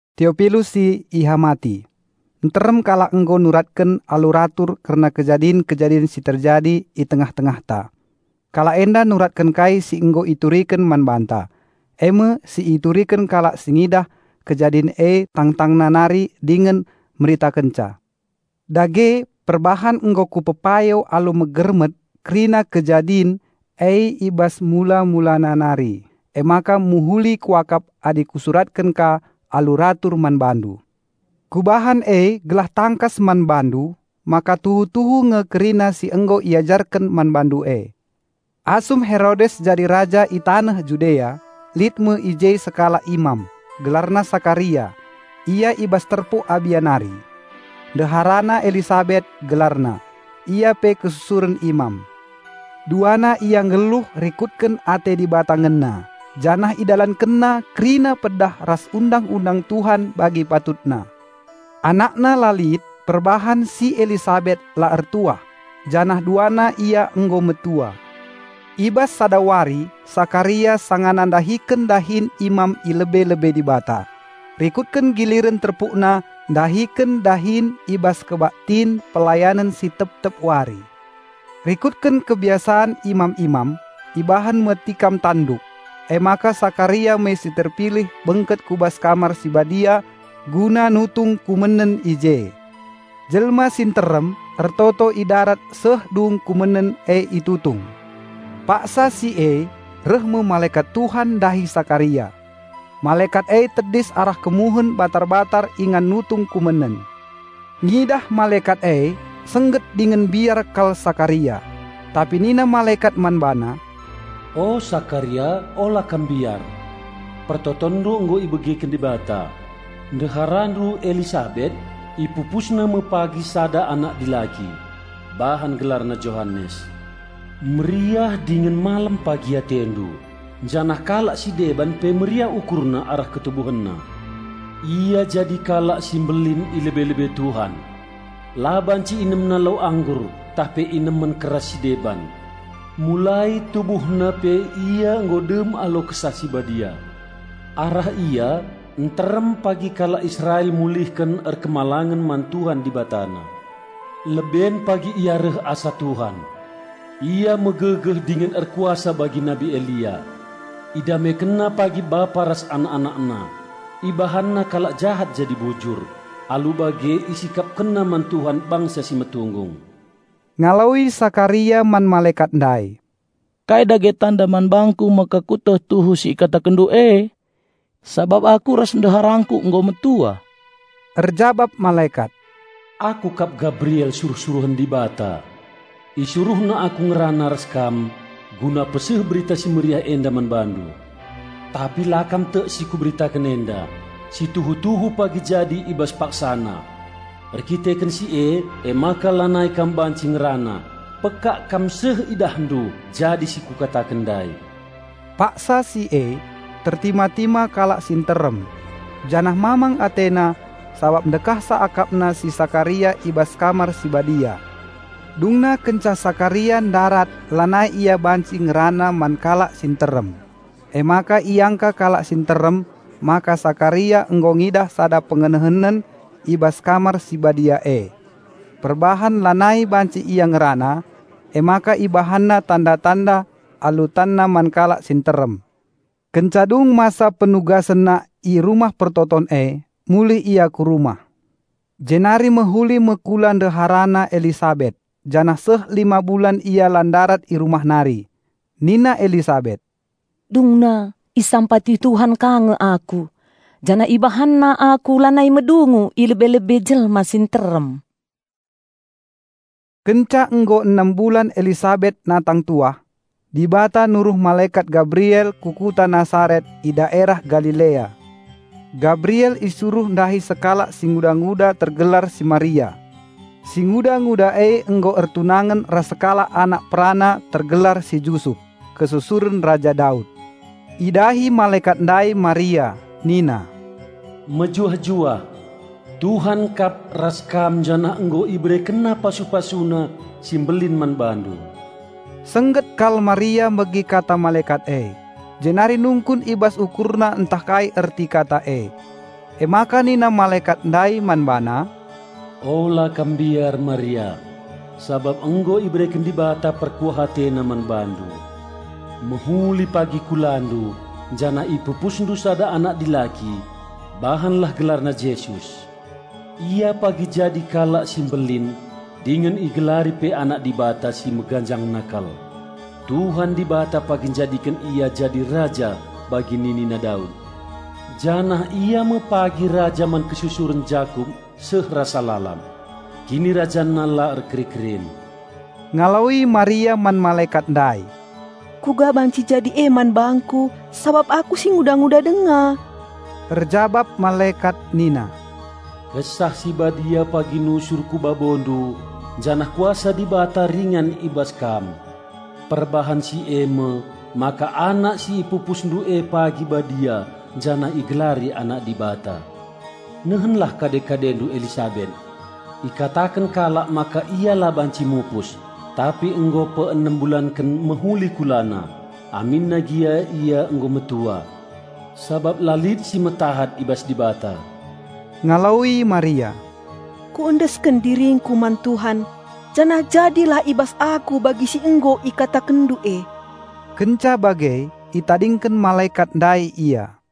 Teopilus si ihamati. Nterem kalak nggo nuratken alu ratur kerna kejadin-kejadin si terjadi i tengah-tengahta. Kalak enda nuratken kai si nggo ituriken man banta, e me si ituriken kalak si ngidah kejadin e tangtangna nari dingen meritakenca. Dage, perbahan nggo kupepayo alu megermet kerina kejadin e i bas mula-mulana nari, emaka mehuli kuakap adi kusuratken ka alu ratur man bandu. Kubahan e gelah tangkas man bandu, maka tuhu-tuhu nge kerina si nggo iajarken man bandu e. Asum Herodes jadi raja i taneh Judea, lit me i je sekalak imam, gelarna Sakaria; ia i bas terpuk Abia nari. Ndeharana Elisabet gelarna; ia pe kesusuren imam. Duana ia nggeluh rikutken ate Dibata ngena janah idalankenna kerina pedah ras Undang-undang Tuhan bagi patutna. Anakna la lit, perbahan si Elisabet la ertuah, janah duana ia nggo metua. I bas sada wari Sakaria sangana ndahiken dahin imam i lebe-lebe Dibata, rikutken giliren terpukna ndahiken dahin i bas kebaktin pelayanen si tep-tep wari. Rikutken kebiasan imam-imam, ibahan me tikam tanduk, emaka Sakaria me si terpilih bengket ku bas Kamar si Badia guna nutung kumenen i je. Jelma si nterem ertoto i darat seh dung kumenen e itutung. Paksa si e, reh me malekat Tuhan ndahi Sakaria. Malekat e tedis arah kemuhen batar-batar ingan nutung kumenen. Ngidah malekat e, sengget dingen mbiar kal Sakaria. Tapi nina malekat man bana, "O, Sakaria ola kam mbiar! Pertotonndu nggo ibegiken Dibata. Ndeharandu Elisabet ipipusna me pagi sada anak dilaki. Bahan gelarna Johanes. Meriah dingen malem pagi atendu, janah kalak si deban pe meriah ukurna arah ketubuhenna. Ia jadi kalak si mbelin i lebe-lebe Tuhan. La banci inemna lau anggur tah pe inemen keras si deban. Mulai tubuhna pe ia nggo dem alu Kesah Si Badia. Arah ia nterem pagi kalak Israel mulihken patuh man Tuhan Dibatana. Leben pagi pagi Ia reh asa Tuhan; ia megegeh dingen erkuasa bagi Nabi Elia. Idamekenna pagi bapa ras anak-anakna; ibahanna kalak jahat jadi bujur; alu bage isikapkenna man Tuhan bangsa si metunggung." Ngaloi Sakaria man malekat ndai, "Kai dage tanda man bangku maka kueteh tuhu si ikatakenndu e? Sabap aku ras ndeharangku nggo metua." Erjabap malekat, "Aku kap Gabriel suruh-suruhen Dibata. IsuruhNa aku ngerana ras kam guna peseh Berita Si Mehuli enda man bandu. Tapi la kam tek si kuberitaken enda, si tuhu-tuhu pagi jadi i bas paksana. Erkiteken si e emaka lanai kam banci ngerana, pekak kam seh idahndu jadi si kukataken ndai." Paksa si e, tertima-tima kalak si nterem, janah mamang atena sabap ndekahsa akapna si Sakaria i bas Kamar si Badia. Dungna kenca Sakaria ndarat lanai ia banci ngerana man kalak si nterem, emaka iangka kalak si nterem maka Sakaria nggo ngidah sada pengenehenen i bas Kamar si Badia e. Perbahan lanai banci ia ngerana, emaka ibahanna tanda-tanda alu tanna man kalak si nterem. Kenca dung masa penugasenna i Rumah Pertoton e, mulih ia ku rumah. Jenari mehuli me kula ndeharana Elisabet janah seh lima bulan ia la ndarat i rumah nari. Nina Elisabet, "Dungna isampati Tuhan ka nge aku, janah IbahanNa aku lanai medungu i lebe-lebe jelma si nterem." Kenca nggo enem bulan Elisabet natang tuah, Dibata nuruh malekat Gabriel ku kuta Nasaret i daerah Galilea. Gibrael isuruh ndahi sekalak singudanguda tergelar si Maria. Singuda-nguda e nggo ertunangen ras sekalak anakperana tergelar si Jusup, kesusuren Raja Daud. Idahi malekat ndai Maria nina, "Mejuah-juah! Tuhan kap ras kam janah nggo IberekenNa pasu-PasuNa si mbelin man bandu!" Sengget kal Maria megi kata malekat e, jenari nungkun i bas ukurna ntah kai erti kata e. Emaka nina malekat ndai man bana, "Ola kam mbiar, Maria, sabap nggo ibereken Dibata perkuah AteNa man bandu. Mehuli pagi kulandu janah ipupusndu sada anak dilaki, bahanlah gelarna Jesus. Ia pagi jadi kalak si mbelin dingen igelari pe Anak Dibata si Meganjangna kal. Tuhan Dibata pagi njadiken Ia jadi Raja bagi ninina Daud, janah Ia me pagi raja man kesusuren Jakup seh rasa lalap; KinirajanNa la erkeri-kerin." Ngaloi Maria man malekat ndai, "Kuga banci jadi e man bangku, sabap aku singuda-nguda denga?" Erjabap malekat nina, "Kesah Si Badia pagi nusur ku babondu janah kuasa Dibata ringan i bas kam. Perbahan si e me, maka anak si ipupusndu e pagi Badia janah igelari Anak Dibata. Nehenlah kade-kadendu Elisabet. Ikataken kalak maka ia la banci mupus, tapi nggo peenem bulanken mehuli kulana, aminna gia ia nggo metua. Sabap la lit si metahat i bas Dibata." Ngaloi Maria, "Kuendesken diringku man Tuhan. Janah jadilah i bas aku bagi si nggo ikatakenndu e!" Kenca bage itadingken malekat ndai ia.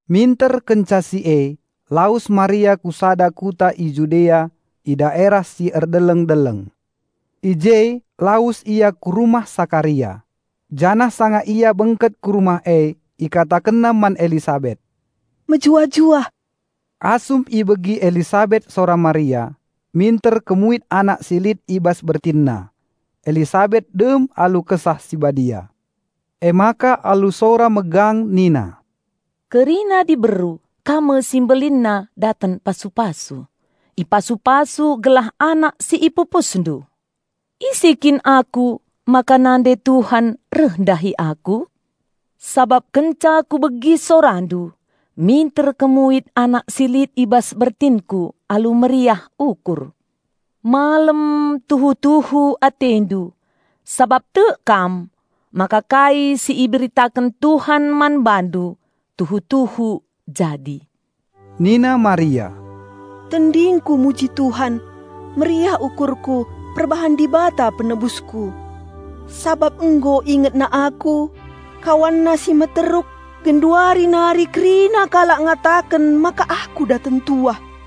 Minter kenca si e, lawes Maria ku sada kuta i Judea i daerah si erdeleng-deleng. I je lawes ia ku rumah Sakaria. Janah sanga ia bengket ku rumah e ikatakenna man Elisabet, "Mejuah-juah." Asum ibegi Elisabet sora Maria, minter kemuit anak si lit i bas bertinna. Elisabet dem alu Kesah Si Badia. Emaka alu sora megang nina, "Kerina diberu, Kam me si mbelinna daten pasu-pasu! Ipasu-pasu gelah anak si ipupusndu! Ise kin aku, maka nande Tuhan reh ndahi aku? Sabap kenca kubegi sorandu, minter kemuit anak si lit i bas bertinku alu meriah ukur. Malem tuhu-tuhu atendu sabap tek kam maka kai si iberitaken Tuhan man bandu tuhu-tuhu jadi." Nina Maria, "Tendingku muji Tuhan. Meriah ukurku perbahan Dibata Penebusku. Sabap nggo IngetNa aku, KawanNa si meteruk! Genduari nari kerina kalak ngataken maka aku daten tuah.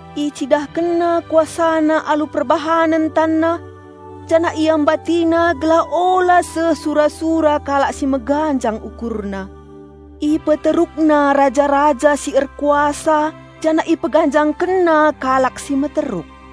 IcidahkenNa KuasaNa alu perbahanen TanNa, janah IambatiNa gelah ola seh sura-sura kalak si meganjang ukurna. IpeterukNa raja-raja si erkuasa, janah IpeganjangkenNa kalak si meteruk.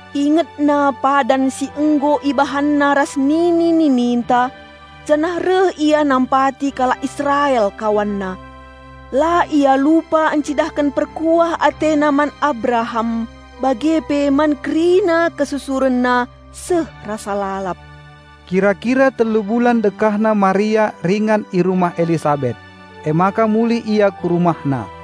IngetNa padan si nggo IbahanNa ras nini-nininta, janah reh Ia nampati kalak Israel KawanNa. La Ia lupa ncidahken perkuah AteNa man Abraham, bage pe man kerina kesusurenna seh rasa lalap." Kira-kira telu bulan dekahna Maria ringan i rumah Elisabet; emaka mulih ia ku rumahna.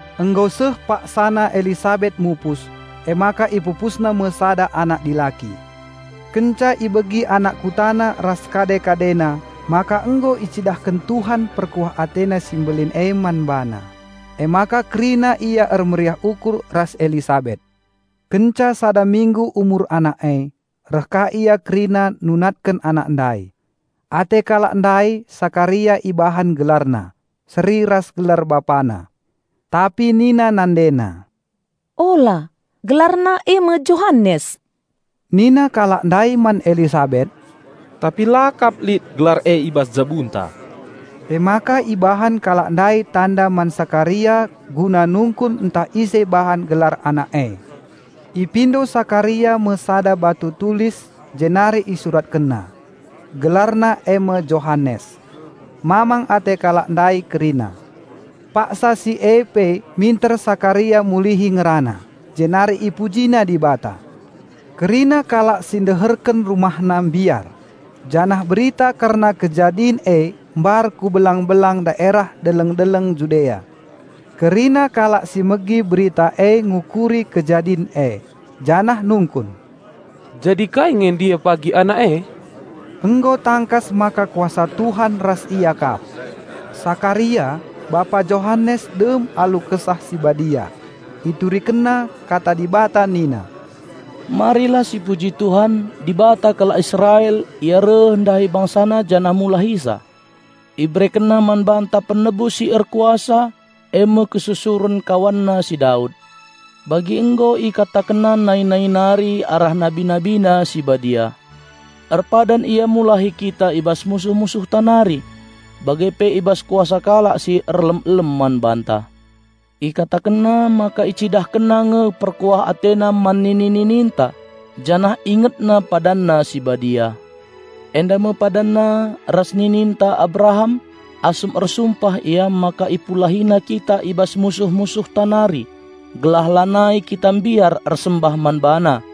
Nggo seh paksana Elisabet mupus, emaka ipupusna me sada anak dilaki. Kenca ibegi anak kutana ras kade-kadena maka nggo icidahken Tuhan perkuah AteNa si mbelin e man bana, emaka kerina ia ermeriah ukur ras Elisabet. Kenca sada minggu umur anak e, reh ka ia kerina nunatken anak ndai. Ate kalak ndai Sakaria ibahan gelarna, seri ras gelar bapana. Tapi nina nandena, "Ula! Gelarna e me Johanes." Nina kalak ndai man Elisabet, "Tapi la kap lit gelar e i bas jabunta." Emaka ibahan kalak ndai tanda man Sakaria guna nungkun ntah ise bahan gelar anak e. Ipindo Sakaria me sada batu tulis, jenari isuratkenna, "Gelarna eme Johanes." Mamang ate kalak ndai kerina. Paksa si e pe minter Sakaria mulihi ngerana, jenari ipujina Dibata. Kerina kalak si deherken rumahna mbiar, janah berita kerna kejadin e mbar ku belang-belang daerah deleng-deleng Judea. Kerina kalak si megi berita e ngukuri kejadin e, janah nungkun, "Jadi kai nge ndai pagi anak e?" Nggo tangkas maka kuasa Tuhan ras ia kap. Sakaria, bapa Johanes dem alu Kesah Si Badia. Iturikenna kata Dibata nina, "Marilah sipuji Tuhan, Dibata kalak Israel Ia reh ndahi bangsana janah mulahisa. IberekenNa man banta Penebus si erkuasa e me kesusuren KawanNa si Daud. Bagi nggo IkatakenNa nai-nai nari arah Nabi NabiNa si Badia, maka erpadan Ia mulahi kita i bas musuh-musuhta nari, bage pe i bas kuasa kalak si er elem-elem man banta. IkatakenNa maka IcidahkenNa nge perkuah AteNa man nini-nininta, janah IngetNa PadanNa si Badia. Enda me PadanNa ras nininta Abraham, asum ersumpah Ia maka IpulahiNa kita i bas musuh-musuhta nari, gelah lanai kita mbiar ersembah man BaNa.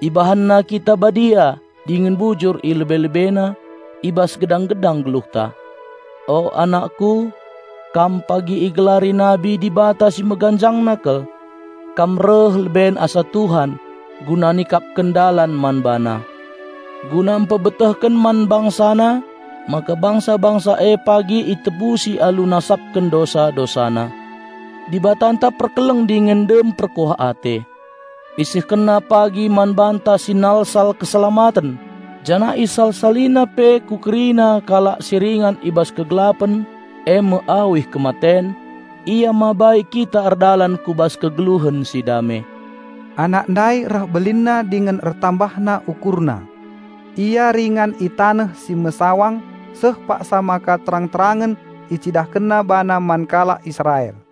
IbahanNa kita Badia dingen bujur ilebe-LebeNa, i bas gedang-gedang geluhta. O, anakku, kam pagi igelari Nabi Dibata Si Meganjangna kal. Kam reh leben asa Tuhan, guna nikapken dalan man BaNa; guna mpebetehken man BangsaNa, maka bangsa-bangsa e pagi itebusi alu nasapken dosa-dosana. Dibatanta perkeleng dingen dem perkuah ate. IsehkenNa pagi man banta sinalsal Keselamaten. Janah isal-salina pe ku kerina kalak si ringan i bas kegelapen e me awih kematen, Ia mabai kita erdalan ku bas kegeluhen si dame." Anak ndai reh belinna dingen ertambahna ukurna. Ia ringan i taneh si mesawang seh paksa maka terang-terangen icidahkenna bana man kalak Israel.